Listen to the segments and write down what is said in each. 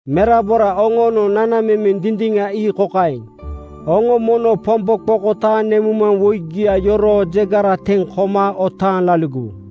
Merabora oŋoonoŋ nanamemeŋ dindiŋa ii kokaeŋ: Oŋo mono Pombo qokotaaŋ nemuŋmaŋwoigia yoroo jegara teŋ koma otaaŋ laligowu.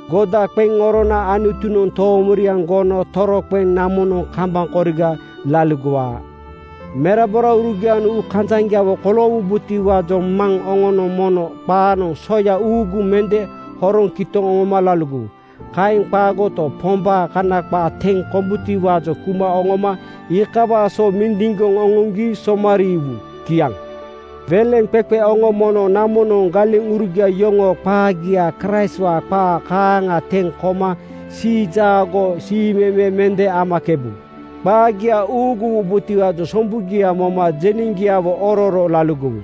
“Goda qeŋ orona Anutunoŋ toomoriaŋ gono toroqeŋ namonoŋ kambaŋ koriga laligowaa.” Meraboraurugianoŋ uukanjaŋgiawo koloowubotiwaajoŋ maŋ oŋonoŋ mono qaanoŋ soya uuguŋ mende horoŋ kitoŋ oŋoma laligowu. Kaeŋ qaagoto, Pombaa Kana qaa teŋ kombutiwaajoŋ kuma oŋoma iikawaa so mindiŋgoŋ oŋoŋgi somariiwu. Kiaŋ. Weleŋqeqe oŋo mono namonoŋ galeŋurugia yoŋoo qaagia Kraistwaa qaa kaaŋa teŋ koma siijaago siimeme mende amakebu. Qaagia uuguwubotiwaajoŋ sombugia moma jeneŋgiawo ororo laligowu.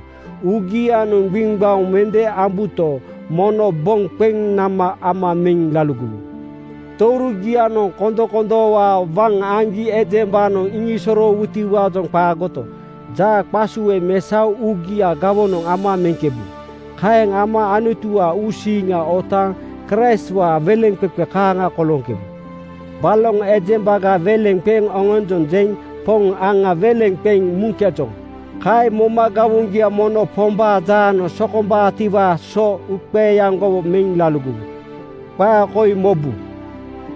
Uugianoŋ gbiŋgbaoŋ mende ambuto, mono boŋ qeŋ nama ama meŋ laligowu. Tourugianoŋ kondokondoowaa waŋ aŋgi ejembanoŋ iŋisosoroowutiwaajoŋ qaagoto, jaaqasue mesaoŋ uugia gawonoŋ ama meŋkebu. Kaeŋ ama Anutuwaa uusiiŋa otaaŋ Kraistwaa weleŋqeqe kaaŋa kolooŋkebu. Baloŋ ejembaga weleŋ qeŋ oŋonjonjeŋ Poŋ aŋa weleŋ qeŋ muŋkejoŋ. Kaeŋ moma gawoŋgia mono Pombaa jaanoŋ sokombaatiwaa so uuqeeaŋgowo meŋ laligowu. Qaa koi mobu: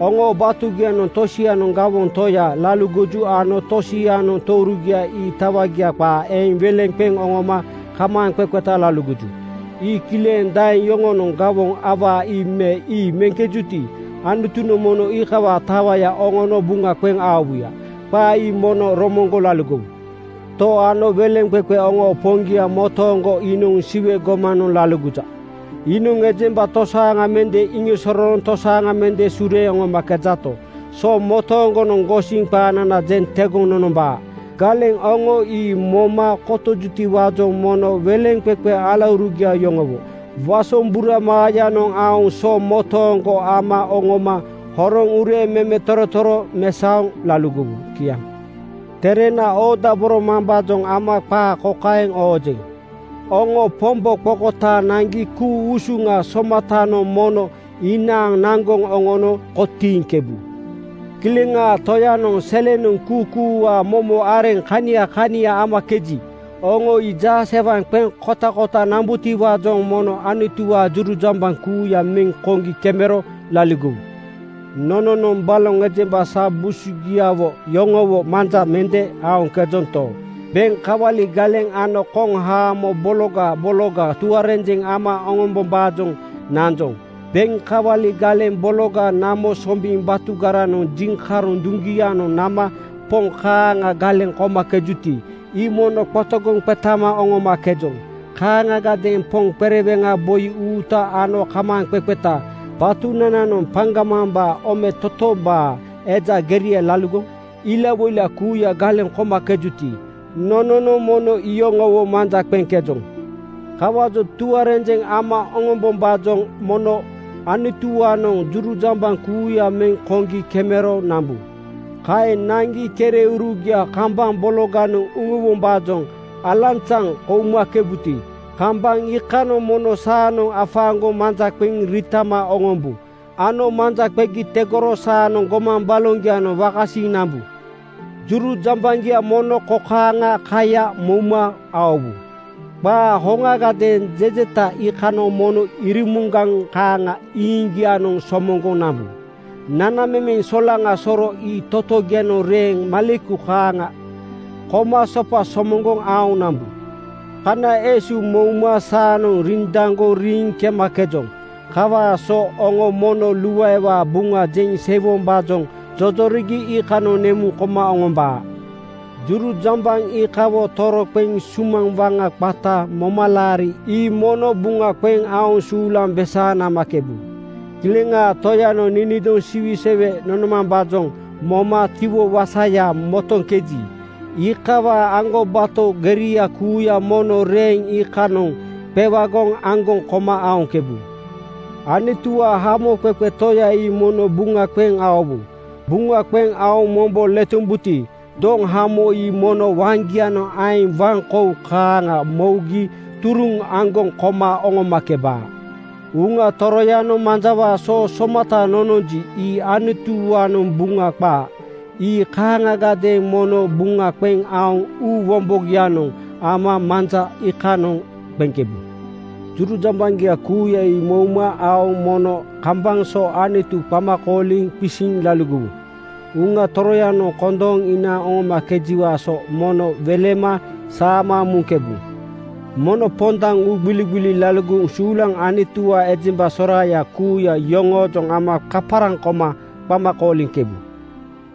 Oŋoo batugianoŋ tosianoŋ gawoŋ toya laligoju ano tosianoŋ tourugia ii tawagia qaa eeŋ weleŋ qeŋ oŋoma kamaaŋqeqeta laligoju. Ii kileŋ daeŋ yoŋonoŋ gawoŋ awaa ii me ii meŋkejuti, Anutunoŋ mono iikawaa tawaya oŋono buŋa qeŋ aowuya. Qaa ii mono romoŋgoŋ laligowu. To ano weleŋqeqe oŋoo Poŋgia motooŋgo iinoŋ Siwe gomanoŋ laligoja. Iinoŋ ejemba tosaaŋa mende iŋisosorooŋ tosaaŋa mende sureeŋ oŋomakejato, so motooŋgonoŋ gosiŋ qaanana jeŋ tegoŋ nonombaa. Galeŋ oŋo ii moma kotojutiwaajoŋ mono weleŋqeqe alaurugia yoŋowo wasombura maayanoŋ aoŋ so motooŋgo ama oŋoma horoŋ ureeŋ memetorotoro mesaoŋ laligowu. Kiaŋ. Terena oodaboromambaajoŋ ama qaa kokaeŋ oojeŋ: Oŋo Pombo qokotaaŋ naŋgi ku-usuŋa somatanoŋ mono inaaŋ naŋgoŋ oŋono kotiiŋkebu. Kileŋaa Toyanoŋ selenoŋ kuukuuwaa momo areŋ kania kania amakeji, oŋo ii jaasewaŋ qeŋ kotakota nambutiwaajoŋ mono Anutuwaa jurujambaŋ kuuya meŋ koŋgi kemero laligowu. Nononoŋ baloŋ ejemba sa busugiawo yoŋowo manja mende aoŋkejonto, beŋ kawali galeŋ ano koŋhaamo bologa bologa tuarenjeŋ ama oŋombombaajoŋ nanjoŋ. Beŋ kawali galeŋ bologa namo sombiŋ batugaranoŋ jiŋkaroŋ duŋgianoŋ nama poŋ kaaŋa galeŋ komakejuti, ii mono qotogoŋ qetama oŋomakejoŋ. Kaaŋagadeeŋ poŋ qereweŋa boi uuta ano kamaaŋqeqeta batunananoŋ paŋgamambaa ometotombaa eja geria laligoŋ ilawoila kuuya galeŋ komakejuti, nononoŋ mono iyoŋowo manja qeŋkejoŋ. Kawaajoŋ tuarenjeŋ ama oŋombombaajoŋ mono Anutuwaanoŋ jurujambaŋ kuuya meŋ koŋgi kemero nambu. Kaeŋ naŋgi kereurugia kambaŋ bologanoŋ uŋuwombaajoŋ alanzaŋ koumakebuti, kambaŋ iikanoŋ mono saanoŋ afaaŋgoŋ manja qeŋ riitama oŋombu ano manja qegi tegoro saanoŋ gomaŋ baloŋgianoŋ wakasiiŋ nambu. Jurujambaŋgia mono kokaaŋa kaya mouma aowu: Qaa hoŋagadeeŋ jejeta iikanoŋ mono irimuŋgaŋ kaaŋa iiŋgianoŋ somoŋgoŋ nambu. Nanamemeŋ solaŋa soro ii totogianoŋ reeŋ maleku kaaŋa koma sopa somoŋgoŋ aoŋ nambu. Kana esu mouma saanoŋ rindaŋgoŋ riiŋ kemakejoŋ. Kawaa so oŋo mono luaewaa Buŋa jeŋ seiwombaajoŋ jojorigi iikanoŋ nemuŋ koma oŋombaa. Jurujambaŋ iikawo toroqeŋ sumaŋ waŋa qata momalaari ii mono buŋa qeŋ aoŋ suulaŋ besaaŋ namakebu. Kileŋaa Toyanoŋ ninidoŋ siwisewe nonomambaajoŋ moma tiwo wasaya motoŋkeji, iikawaa aŋgobato geria kuuya mono reeŋ iikanoŋ qewagoŋ aŋgoŋ koma aoŋkebu. Anutuwaa Hamoqeqe Toya ii mono buŋa qeŋ aowu. Buŋa qeŋ aoŋ mombo letombuti, doŋhamo ii mono waŋgianoŋ aeŋ waŋkou kaaŋa mougi turuŋ aŋgoŋ koma oŋomakebaa. Uŋa Toroyanoŋ manjawaa soo somata nononji, ii Anutuwaanoŋ Buŋa qaa. Ii kaaŋagadeeŋ mono buŋa qeŋ aoŋ uu wombogianoŋ ama manja iikanoŋ qeŋkebu. Jurujambaŋgia kuuya ii mouma aoŋ mono kambaŋ so Anutu qama kooliŋ qisiŋ laligowu. Uŋa Toroyanoŋ kondooŋ inaaŋ oŋomakejiwaa so mono welema saama muŋkebu. Mono pondaŋ uugbiligbili laligoŋ suulaŋ Anutuwaa ejemba soraaya kuuya yoŋoojoŋ ama kaparaŋ koma qama kooliŋkebu.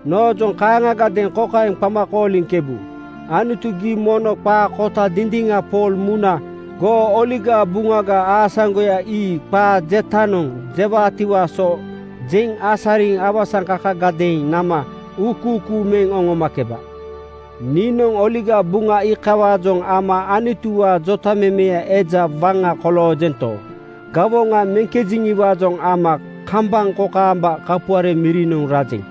Noojoŋ kaaŋagadeeŋ kokaeŋ qama kooliŋkebu, “Anutu, gii mono qaa kota dindiŋa Pool muna goo Oligaa Buŋaga aasaŋgoya ii qaa jetanoŋ jewaatiwaa so jeŋ asariŋ awasaŋkakagadeeŋ nama uukuukuu meŋ oŋomakeba.” Niinoŋ Oligaa Buŋa iikawaajoŋ ama Anutuwaa jotamemeya eja waŋa koloojento, gawoŋa meŋkejeŋiwaajoŋ ama kambaŋ kokaamba kapuare mirinoŋ rajeŋ.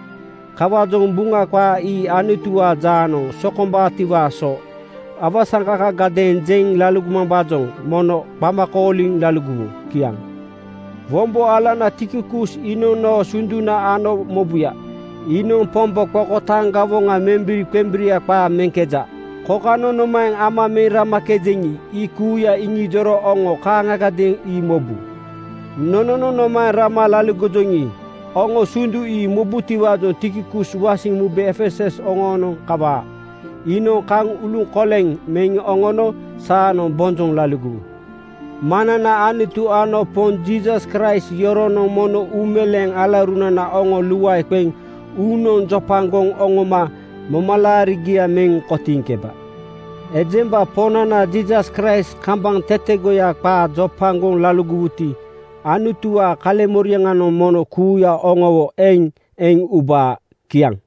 Kawaajoŋ Buŋa qaa ii Anutuwaa jaanoŋ sokombaatiwaa so awasaŋkakagadeeŋ jeŋ laligomambaajoŋ mono qama kooliŋ laligowu. Kiaŋ. Wombo alana Tikikus iinoŋ noo sunduna ano mobuya. Iinoŋ Pombo qokotaaŋ gawoŋa membiri-qembiria qaa meŋkeja. Kokanoŋ nomaeŋ ama meŋ ramakejeŋi, ii kuuya iŋijoro oŋo kaaŋagadeeŋ ii mobu. Nononoŋ nomaeŋ rama laligojoŋi, oŋo sundu ii mobutiwaajoŋ Tikikus wasiŋ mube Efesus oŋoonoŋ kawaa. Iinoŋ kaŋ uluŋkoleŋ meŋ oŋono saanoŋ bonjoŋ laligowu. Maŋnana Anutu ano Poŋ Jiisas Kraist yoronoŋ mono uumeleeŋ alaurunana oŋo luae qeŋ uunoŋ jopagoŋ oŋoma momalaarigia meŋ kotiiŋkeba. Ejemba Poŋnana Jiisas Kraist kambaŋ tetegoya qaa jopagoŋ laligowuti, Anutuwaa kaleŋmoriaŋanoŋ mono kuuya oŋowo eŋ eŋ ubaa. Kiaŋ.